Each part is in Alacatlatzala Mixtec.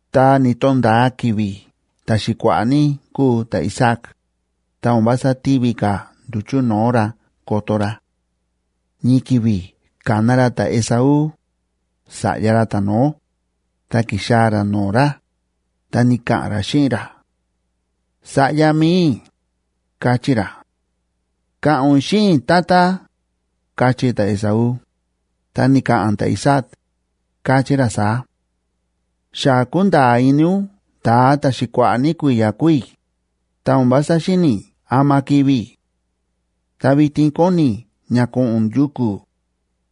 Ta ni̱to̱nda̱a ki̱vi̱ ta̱xi̱kua̱ꞌa̱ ní kúu ta̱Isaac, ta o̱n vása tívi ka̱ nduchu̱ no̱o̱ ra koto ra. Ñii ki̱vi̱ ka̱na ra ta̱Esaú, sa̱ꞌya ra ta̱no̱ó, ta ki̱xaa̱ ra no̱o̱ ra, ta ni̱ka̱ꞌa̱n ra xíꞌin ra: ―Sa̱ꞌya mi̱i i̱ ―káchí ra. ―Ka̱ꞌa̱n ún xíꞌin i̱, tata ―káchí ta̱Esaú. Ta ni̱ka̱ꞌa̱n ta̱Isaac, káchí ra saá: ―Xa kúnda̱a̱ ini ún ta̱a ta̱ xa kua̱ꞌa̱ ní kui̱ya̱ kúu i̱, ta o̱n vása xíni̱ i̱ ama kivi̱ i̱. Ta vitin kóni i̱ ña ko̱ꞌo̱n ún yuku̱,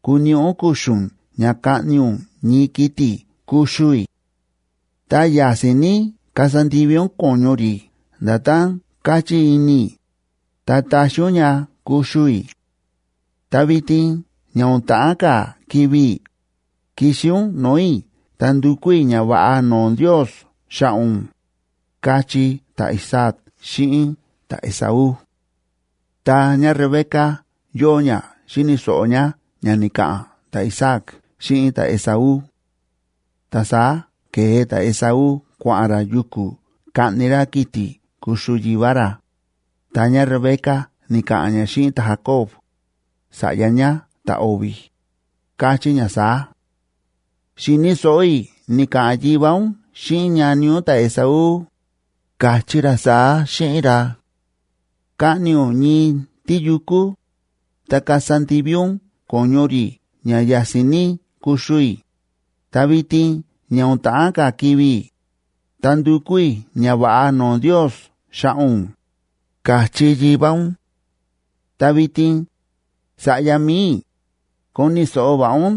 kuniꞌi ún kuxu̱n ña kaꞌni ún ñii kiti̱ kuxu i̱. Ta ya̱si̱n ní kasa ndivi ún ko̱ñu rí nda̱tán káchí ini i̱, ta taxi ún ña kuxu i̱. Ta vitin ña o̱n ta̱ꞌán ka̱ kivi̱ i̱, kixi ún no̱o̱ i̱ ta ndukú i̱ ñava̱ꞌa no̱o̱ Ndios xa̱ꞌa̱ ún ―káchí ta̱Isaac xíꞌin ta̱Esaú. Ta ñáRebeca yóo ñá xíni̱ so̱ꞌo ñá ña ni̱ka̱ꞌa̱n ta̱Isaac xíꞌin ta̱Esaú. Ta saá ke̱e ta̱Esaú kua̱ꞌa̱n ra yuku̱ kaꞌni ra kiti̱ kuxu yivá ra, ta ñáRebeca ni̱ka̱ꞌa̱n ñá xíꞌin ta̱Jacob, sa̱ꞌya ñá ta̱o̱vi̱, káchí ñá saá: ―Xi̱ni̱ so̱ꞌo i̱ ni̱ka̱ꞌa̱n yivá ún xíꞌin ñani ún ta̱Esaú, ka̱chí ra saá xíꞌin ra: “Kaꞌni ún ñii tíyukú, ta kasa ndivi ún ko̱ñu rí ña ya̱si̱n ní kuxu i̱, ta vitin ña o̱n ta̱ꞌán ka̱ kivi̱ i̱, ta ndukú i̱ ñava̱ꞌa no̱o̱ Ndiosa xa̱ꞌa̱ ún”, ka̱chí yivá ún. Ta vitin, sa̱ꞌya mi̱i i̱, koni̱ so̱ꞌo va̱ꞌa ún,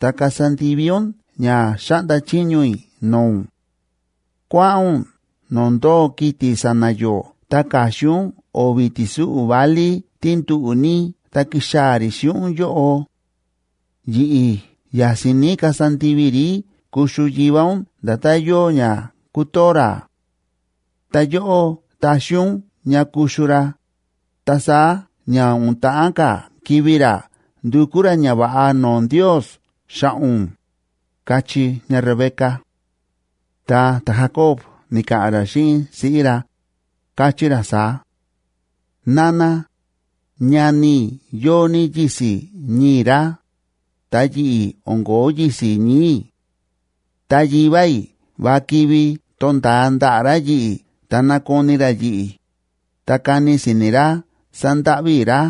ta kasa ndivi ún ña xáꞌnda chiño i̱ no̱o̱ ún. Kua̱ꞌa̱n ún no̱o̱ ndóo kiti̱ sa̱na̱ yó ta ka̱xin ún o̱vi̱ ti̱súꞌu̱ válí tí nduꞌu̱ ní ta kixaa̱ rí xíꞌin ún yóꞌo. Yi̱ꞌi̱ ya̱si̱n ní kasa ndivi i̱ rí kuxu yivá ún nda̱tán yóo ña kútoo ra. Ta yóꞌó taxi ún ña kuxu ra, ta saá ña o̱n ta̱ꞌán ka̱ kivi̱ ra ndukú ra ñava̱ꞌa no̱o̱ Ndios xa̱ꞌa̱ ún ―káchí ñáRebeca. Ta ta̱Jacob ni̱ka̱ꞌa̱n ra xíꞌin siꞌí ra, káchí ra saá: ―Nana, ñani i̱ yóo ní yisi̱ ñii̱ ra, ta yi̱ꞌi̱ o̱n ko̱ó yisi̱ ñii̱ i̱. Ta yivá i̱ va kivi to̱nda̱a ndaꞌa̱ ra yi̱ꞌi̱ ta nakoni ra yi̱ꞌi̱, ta kani si̱ni̱ ra sándáꞌví i̱ ra,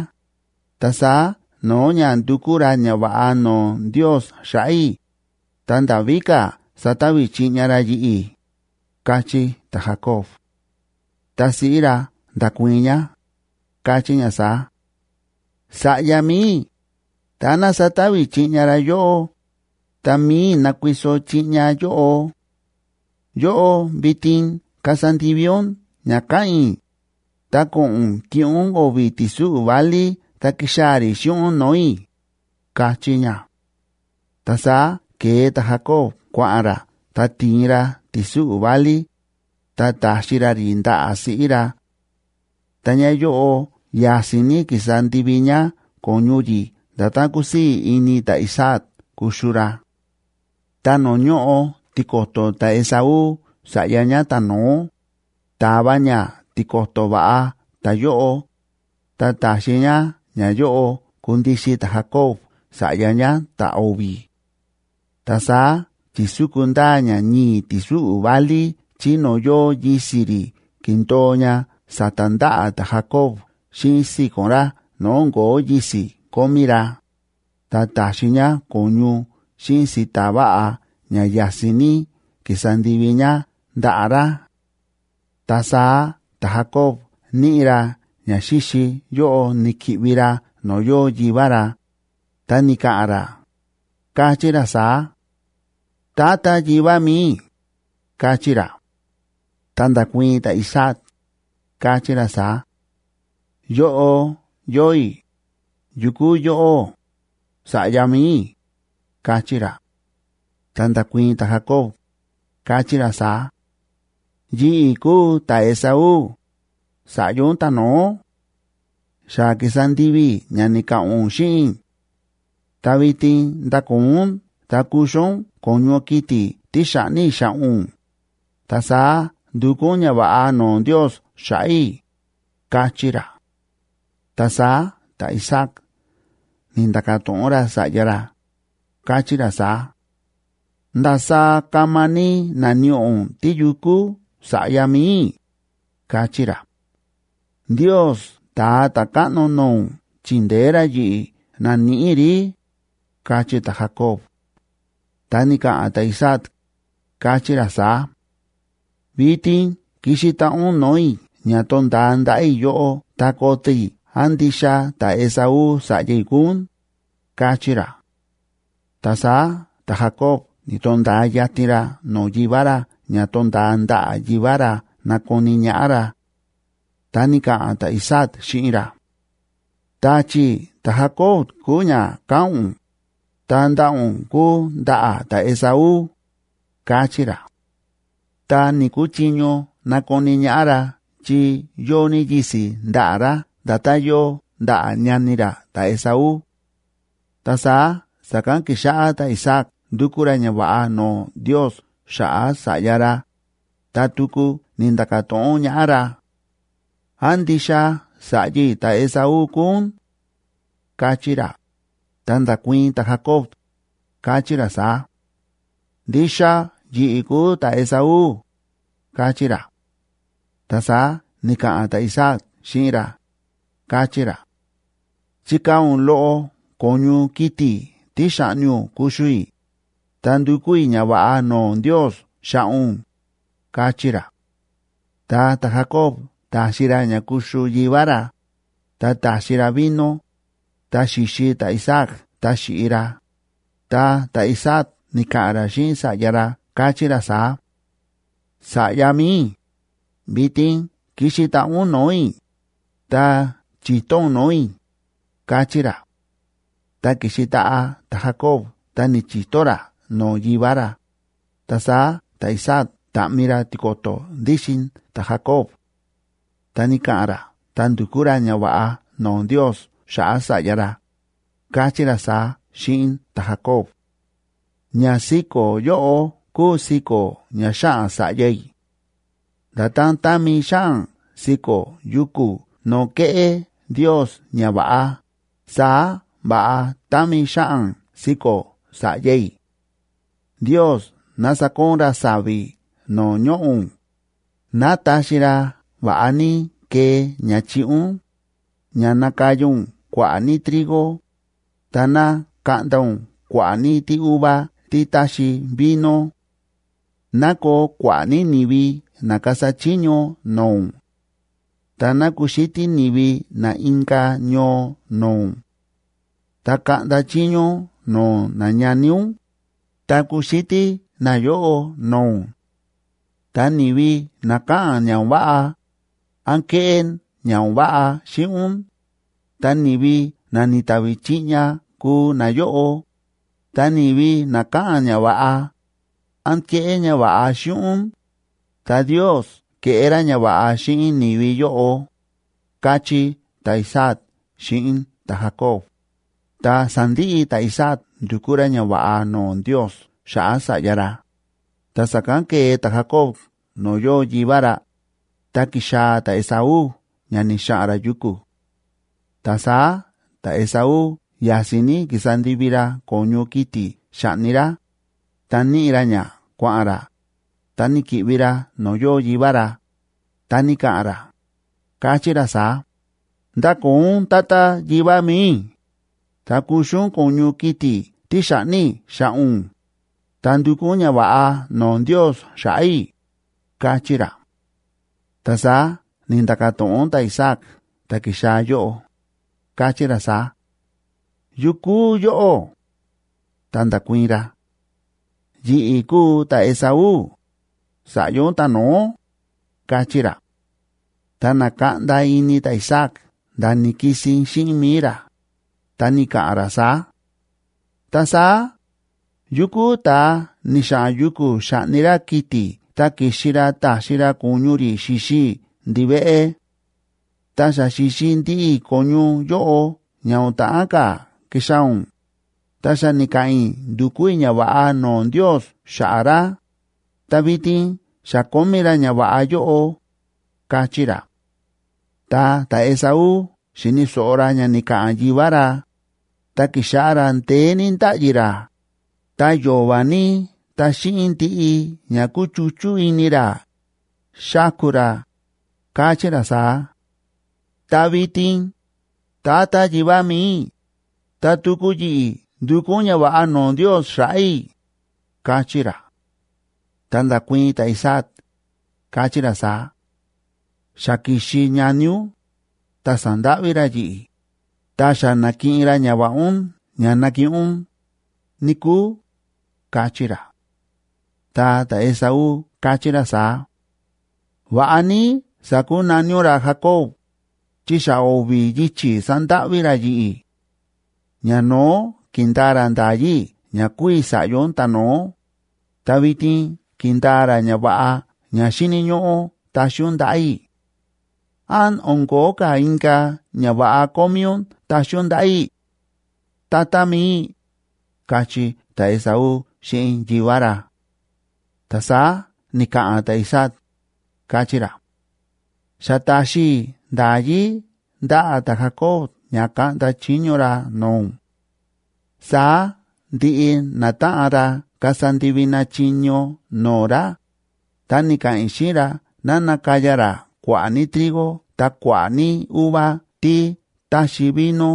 ta saá no̱o̱ ña ndukú ra ñava̱ꞌa no̱o̱ Ndios xa̱ꞌa̱ i̱, ta nda̱ víka̱ sata̱vi̱ chiꞌña ra yi̱ꞌi̱ ―káchí ta̱Jacob. Ta siꞌí ra nda̱kuii̱n ñá, káchí ñá saá: ―Sa̱ꞌya mi̱i i̱, táná sata̱vi̱ chiꞌña ra yóꞌó, ta mi̱i i̱ nakuiso chiꞌña yóꞌo. Yóꞌó vitin kasa ndivi ún ña káꞌa̱n i̱, ta ko̱ꞌo̱n ún kiꞌin ún o̱vi̱ ti̱súꞌu̱ válí ta kixaa̱ rí xíꞌin ún no̱o̱ i̱ ―káchí ñá. Ta saá ke̱e ta̱Jacob kua̱ꞌa̱n ra ta ti̱in ra ti̱súꞌu̱ válí, ta ta̱xi ra rí ndaꞌa̱ siꞌí ra. Ta ñáyóꞌo ya̱si̱n ní ki̱sa ndivi ñá ko̱ñu rí nda̱tán kúsii̱ ini ta̱Isaac kuxu ra. Ta no̱o̱ ñóꞌo tiko̱to̱ ta̱Esaú sa̱ꞌya ñá ta̱no̱ó, ta̱va ñá tiko̱to̱ va̱ꞌa ta̱yóꞌo, ta ta̱xi ñá ñayóꞌo kundixin ta̱Jacob sa̱ꞌya ñá ta̱o̱vi̱. Ta saá chi̱súku ndaa ñá ñii̱ ti̱súꞌu̱ válí chí no̱o̱ yóo yisi̱ rí kindo̱o ña sa̱ta̱ ndaꞌa̱ ta̱Jacob xíꞌin si̱ko̱n ra no̱o̱ o̱n ko̱ó yisi̱ kómí ra, ta ta̱xi ñá ko̱ñu xíꞌin si̱ta̱ va̱ꞌa ña ya̱si̱n ní ki̱sa ndivi ñá ndaꞌa̱ ra. Ta saá ta̱Jacob níꞌi ra ñaxíxi yóꞌo ni̱ki̱ꞌvi ra no̱o̱ yóo yivá ra, ta ni̱ka̱ꞌa̱n ra, káchí ra saá: ―Tata yivá mi̱i i̱ ―káchí ra. Ta nda̱kuii̱n ta̱Isaac, káchí ra saá: ―Yóꞌo yóo i̱. ¿Yu kúu yóꞌó?, sa̱ꞌya mi̱i i̱ ―káchí ra. Ta nda̱kuii̱n ta̱Jacob, káchí ra saá: ―Yi̱ꞌi̱ kúu ta̱Esaú, sa̱ꞌya ún ta̱no̱ó. Xa ki̱sa ndivi i̱ ña ni̱ka̱ꞌa̱n ún xíꞌin i̱. Ta vitin ndakoo ún ta kuxu ún ko̱ñu kiti̱ tí xa̱ꞌni i̱ xa̱ꞌa̱ ún, ta saá ndukú ún ñava̱ꞌa no̱o̱ Ndios xa̱ꞌa̱ i̱ ―káchí ra. Ta saá ta̱Isaac ni̱nda̱ka̱ to̱ꞌon ra sa̱ꞌya ra, káchí ra saá: ―¿Ndasaá kama ní na̱níꞌi ún tíyukú?, sa̱ꞌya mi̱i i̱ ―káchí ra. ―Ndios ta̱a ta̱káꞌno no̱o̱ ún chi̱ndeé ra yi̱ꞌi̱ na̱níꞌi i̱ rí ―káchí ta̱Jacob. Ta ni̱ka̱ꞌa̱n ta̱Isaac, káchí ra saá: ―Vitin kixi taꞌa ún no̱o̱ i̱ ña to̱nda̱a ndaꞌa̱ i̱ yóꞌó ta koto i̱ án ndixa ta̱Esaú sa̱ꞌya i̱ kúu ún ―káchí ra. Ta saá ta̱Jacob ni̱to̱nda̱a yatin ra no̱o̱ yivá ra ña to̱nda̱a ndaꞌa̱ yivá ra nakoni ñaꞌá ra. Ta ni̱ka̱ꞌa̱n ta̱Isaac xíꞌin ra: ―Ta̱chi̱ ta̱Jacob kúu ña káꞌa̱n ún, ta ndaꞌa̱ ún kúu ndaꞌa̱ ta̱Esaú ―káchí ra. Ta ni̱‑kuchiño nakoni ñaꞌá ra chi yóo ní yisi̱ ndaꞌa̱ ra nda̱tán yóo ndaꞌa̱ ñani ra ta̱Esaú. Ta saá sa̱kán ki̱xáꞌá ta̱Isaac ndukú ra ñava̱ꞌa no̱o̱ Ndios xa̱ꞌa̱ sa̱ꞌya ra, ta tuku ni̱nda̱ka̱ to̱ꞌon ñaꞌá ra: ―¿Án ndixa sa̱ꞌya i̱ ta̱Esaú kúu ún? ―káchí ra. Ta nda̱kuii̱n ta̱Jacob, káchí ra saá: ―Ndixa yi̱ꞌi̱ kúu ta̱Esaú ―káchí ra. Ta saá ni̱ka̱ꞌa̱n ta̱Isaac xíꞌin ra, káchí ra: ―Chikaa̱ ún loꞌo ko̱ñu kiti̱ tí xa̱ꞌni ún kuxu i̱, ta ndukú i̱ ñava̱ꞌa no̱o̱ Ndios xa̱ꞌa̱ ún ―káchí ra. Ta ta̱Jacob ta̱xi ra ña kuxu yivá ra, ta ta̱xi ra vino, ta xi̱xi ta̱Isaac ta xi̱ꞌi ra, ta ta̱Isaac ni̱ka̱ꞌa̱n ra xíꞌin sa̱ꞌya ra, káchí ra saá: ―Sa̱ꞌya mi̱i i̱, vitin kixi taꞌa ún no̱o̱ i̱, ta chi̱to ún no̱o̱ i̱ ―káchí ra. Ta ki̱xi taꞌa ta̱Jacob ta ni̱chi̱to ra no̱o̱ yivá ra, ta saá ta̱Isaac ta̱ꞌmi ra tiko̱to̱ ndíxin ta̱Jacob. Ta ni̱ka̱ꞌa̱n ra ta ndu̱kú ra ñava̱ꞌa no̱o̱ Ndios xa̱ꞌa̱ sa̱ꞌya ra, káchí ra saá xíꞌin ta̱Jacob: Ñasiko̱ yóꞌo kúu siko̱ ña xáꞌan sa̱ꞌya i̱. Nda̱tán támi xáꞌan siko̱ yuku̱ no̱o̱ kéꞌé Ndios ñava̱ꞌa, saá va̱ꞌa támi xáꞌan siko̱ sa̱ꞌya i̱. Ndios ná sakoon ra sa̱vi̱ no̱o̱ ñoꞌo̱ ún, ná taxi ra va̱ꞌa ní kee ña chiꞌi ún, ña nakaya ún kua̱ꞌa̱ ní trigo, ta ná kaꞌnda ún kua̱ꞌa̱ ní tíuva tí táxi vino. Ná koo kua̱ꞌa̱ ní ni̱vi na kasa chiño no̱o̱ ún; ta ná kuxítí ni̱vi na inka̱ ñoo no̱o̱ ún. Ta kaꞌnda chiño ún no̱o̱ nañani ún, ta kuxítí nayóꞌo no̱o̱ ún. Ta ni̱vi na káꞌa̱n ña o̱n váꞌa, án kéꞌé ña o̱n váꞌa xíꞌin ún, ta ni̱vi na ni̱tavi chiꞌña kuu nayóꞌo, ta ni̱vi na káꞌa̱n ñava̱ꞌa, án kéꞌé ñava̱ꞌa xíꞌin ún, ta Ndios keꞌé ra ñava̱ꞌa xíꞌin ni̱vi yóꞌo, káchí ta̱Isaac xíꞌin ta̱Jacob. Ta sa̱ndiꞌi ta̱Isaac ndu̱kú ra ñava̱ꞌa no̱o̱ Ndios xa̱ꞌa̱ sa̱ꞌya ra, ta sa̱kán ke̱e ta̱Jacob no̱o̱ yóo yivá ra, ta ki̱xaa̱ ta̱Esaú ña ni̱xa̱ꞌa̱n ra yuku̱. Ta saá ta̱Esaú ya̱si̱n ní ki̱sa ndivi ra ko̱ñu kiti̱ xa̱ꞌni ra, ta níꞌi ra ña kua̱ꞌa̱n ra, ta ni̱ki̱ꞌvi ra no̱o̱ yóo yivá ra, ta ni̱ka̱ꞌa̱n ra, káchí ra saá: ―Ndakoo ún, tata yivá mi̱i i̱, ta kuxu ún ko̱ñu kiti̱ tí xa̱ꞌni i̱ xa̱ꞌa̱ ún, ta ndukú ún ñava̱ꞌa no̱o̱ Ndios xa̱ꞌa̱ i̱ ―káchí ra. Ta saá ni̱nda̱ka̱ to̱ꞌon ta̱Isaac ta̱ ki̱xaa̱ yóꞌo, káchí ra saá: ―¿Yu kúu yóꞌó? Ta nda̱kuii̱n ra: ―Yi̱ꞌi̱ kúu ta̱Esaú, sa̱ꞌya ún ta̱no̱ó ―káchí ra. Ta na̱kaꞌnda ini ta̱Isaac nda̱ ni̱kisin xíꞌin mi̱i ra, ta ni̱ka̱ꞌa̱n ra saá: ―Ta saá, ¿yu kúu ta̱a ni̱xa̱ꞌa̱n yuku̱ xa̱ꞌni ra kiti̱ ta ki̱xi ra ta̱xi ra ko̱ñu rí xi̱xi i̱ ndiveꞌe? Ta xa xi̱xi ndiꞌi i̱ ko̱ñu yóꞌo ña o̱n ta̱ꞌán ka̱ kixaa̱ ún, ta xa ni̱ka̱ꞌa̱n i̱ ndu̱kú i̱ ñava̱ꞌa no̱o̱ Ndios xa̱ꞌa̱ ra, ta vitin xa kómí ra ñava̱ꞌa yóꞌo ―káchí ra. Ta ta̱Esaú xi̱ni̱ so̱ꞌo ra ña ni̱ka̱ꞌa̱n yivá ra, ta ki̱xáꞌá ra ndeé ní ndáꞌyi ra, ta yo̱va̱ ní ta xíꞌin ndiꞌi ña kúchuchú ini ra, xáku ra, káchí ra saá: ―Ta vitin, tata yivá mi̱i i̱, ta tuku yi̱ꞌi̱ ndukú ún ñava̱ꞌa no̱o̱ Ndios xa̱ꞌa̱ i̱ ―káchí ra. Ta nda̱kuii̱n ta̱Isaac, káchí ra saá: ―Xa ki̱xi ñani ún, ta sa̱ndáꞌví ra yi̱ꞌi̱, ta xa na̱kiꞌin ra ñava̱ꞌa ún ña nakiꞌin ún, níkúu ―káchí ra. Ta ta̱Esaú káchí ra saá: ―Va̱ꞌa ní sa̱kunaní ún ra Jacob,b chi xa o̱vi̱ yichi̱ sa̱ndáꞌví ra yi̱ꞌi̱. Ñano̱ó ki̱ndaa ra nda̱yí i̱ ña kúu i̱ sa̱ꞌya ún ta̱no̱ó, ta vitin ki̱ndaa ra ñava̱ꞌa ña xíni̱ ñóꞌó taxi ún ndaꞌa̱ i̱. ¿Án o̱n ko̱ó ka̱ inka̱ ñava̱ꞌa kómí ún taxi ún ndaꞌa̱ i̱?, tata mi̱i i̱ ―káchí ta̱Esaú xíꞌin yivá ra. Ta saá ni̱ka̱ꞌa̱n ta̱Isaac, káchí ra: ―Xa ta̱xi i̱ nda̱yí ndaꞌa̱ ta̱Jacob ña kaꞌnda chiño ra no̱o̱ ún; saá ndiꞌi natáꞌan ra kasa ndivi na chiño no̱o̱ ra, ta ni̱ka̱ꞌa̱n i̱ xíꞌin ra ná nakaya ra kua̱ꞌa̱ ní trigo ta kua̱ꞌa̱ ní uva tí táxi vino.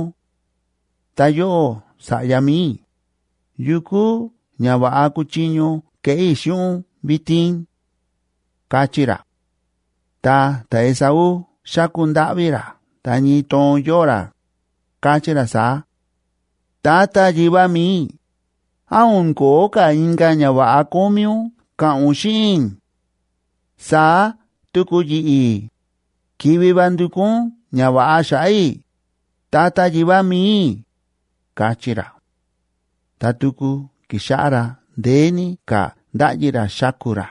Ta yóꞌó sa̱ꞌya mi̱i i̱, ¿yu kúu ñava̱ꞌa kúchiño keꞌé i̱ xíꞌin ún vitin? ―káchí ra. Ta ta̱Esaú xa̱ku ndáꞌví ra ta ñii toon yóo ra, káchí ra saá: ―Tata yivá mi̱i i̱, ¿án o̱n ko̱ó ka̱ inka̱ ñava̱ꞌa kómí ún ka̱ꞌa̱n ún xíꞌin i̱? Saá tuku yi̱ꞌi̱, kivi va ndukú ún ñava̱ꞌa xa̱ꞌa̱ i̱, tata yivá mi̱i i̱ ―káchí ra. Ta tuku ki̱xáꞌá ra ndeé ní ka̱ ndáꞌyi ra xáku ra.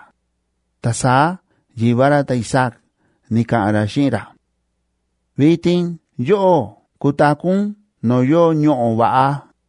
Ta saá yivá ra ta̱Isaac ni̱ka̱ꞌa̱n ra xíꞌin ra: Vitin yóꞌó kutaku̱ ún no̱o̱ yóo ñoꞌo̱ va̱ꞌa,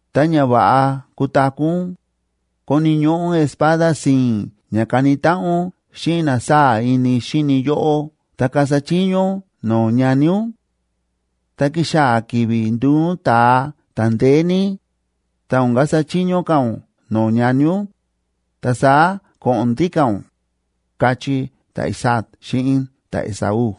Ta ña va̱ꞌa kutaku̱ ún, koni̱ ñóꞌó ún espada si̱i̱n ña kani táꞌan ún xíꞌin na sáa̱ ini xíni yóꞌó ta kasa chiño ún no̱o̱ ñani ún; ta kixaa̱ ki̱vi̱ nduu ún ta̱a ta̱ndeé ní, ta o̱n kasa chiño ka̱ ún no̱o̱ ñani ún, ta saá ko̱ꞌo̱n ndíka̱ ún, káchí ta̱Isaac xíꞌin ta̱Esaú.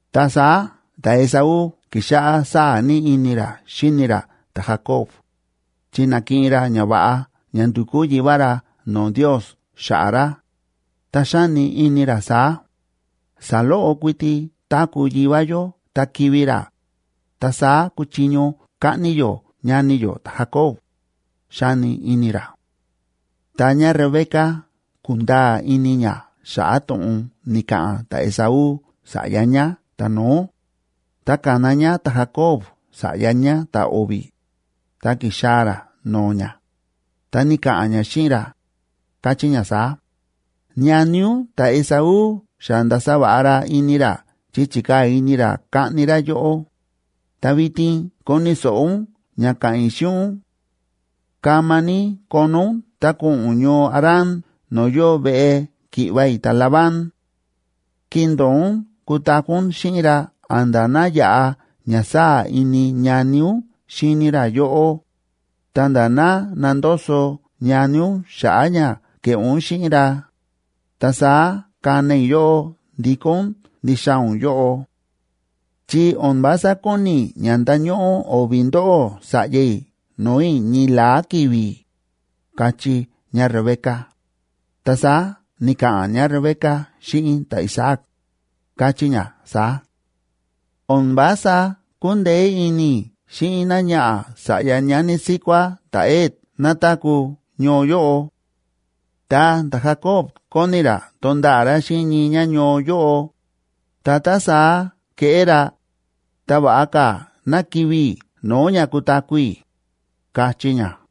Ta saá ta̱Esaú ki̱xáꞌá sáa̱ ní ini ra xíni ra ta̱Jacob, chi na̱kiꞌin ra ñava̱ꞌa ña ndu̱kú yivá ra no̱o̱ Ndios xa̱ꞌa̱ ra, ta xáni ini ra saá: “Saloꞌo kuiti táku̱ yivá yó ta kivi̱ ra, ta saá kuchiño kaꞌni yó ñani yó ta̱Jacob”, xáni ini ra. Ta ñáRebeca ku̱nda̱a̱ ini ñá xa̱ꞌa̱ to̱ꞌon ni̱ka̱ꞌa̱n ta̱Esaú sa̱ꞌya ñá ta̱no̱ó, ta ka̱na ñá ta̱Jacob sa̱ꞌya ñá ta̱o̱vi̱, ta ki̱xaa̱ ra no̱o̱ ñá, ta ni̱ka̱ꞌa̱n ñá xíꞌin ra, káchí ñá saá: ―Ñani ún ta̱Esaú xa nda̱sa va̱ꞌa ra ini ra chi chi̱kaa̱ ini ra kaꞌni ra yóꞌó. Ta vitin koni̱ so̱ꞌo ún ña ka̱ꞌa̱n i̱ xíꞌin ún. Kama ní kono ún ta ko̱ꞌo̱n ún ñoo Harán no̱o̱ yóo veꞌe ki̱ꞌva̱ i̱ ta̱Labán. Kindo̱o ún kutaku̱ ún xíꞌin ra a̱nda̱ ná yaꞌa ña sáa̱ ini ñani ún xíni ra yóꞌó, ta̱nda̱ ná nandoso ñani ún xa̱ꞌa̱ ña ke̱ꞌé ún xíꞌin ra. Ta saá kana i̱ yóꞌó ndikó ún ndixaa̱ ún yóꞌo. Chi o̱n vása kóni i̱ ña ndañóꞌó o̱vi̱ ndóꞌó sa̱ꞌya i̱ no̱o̱ i̱ ñii la̱á ki̱vi̱ ―káchí ñáRebeca. Ta saá ni̱ka̱ꞌa̱n ñáRebeca xíꞌin ta̱Isaac, káchí ñá saá: ―O̱n vása kúndeé ini i̱ xíꞌin náñaꞌa̱ sa̱ꞌya ñani síkuá ta̱Het ná táku̱ ñoo yóꞌo. Tá ta̱Jacob kóni ra tonda̱ꞌa̱ ra xíꞌin ñii ñáñoo yóꞌo, ta tá saá keꞌé ra, ta va̱ꞌa ka̱ ná kivi̱ i̱ no̱o̱ ña kutaku̱ i̱ ―káchí ñá.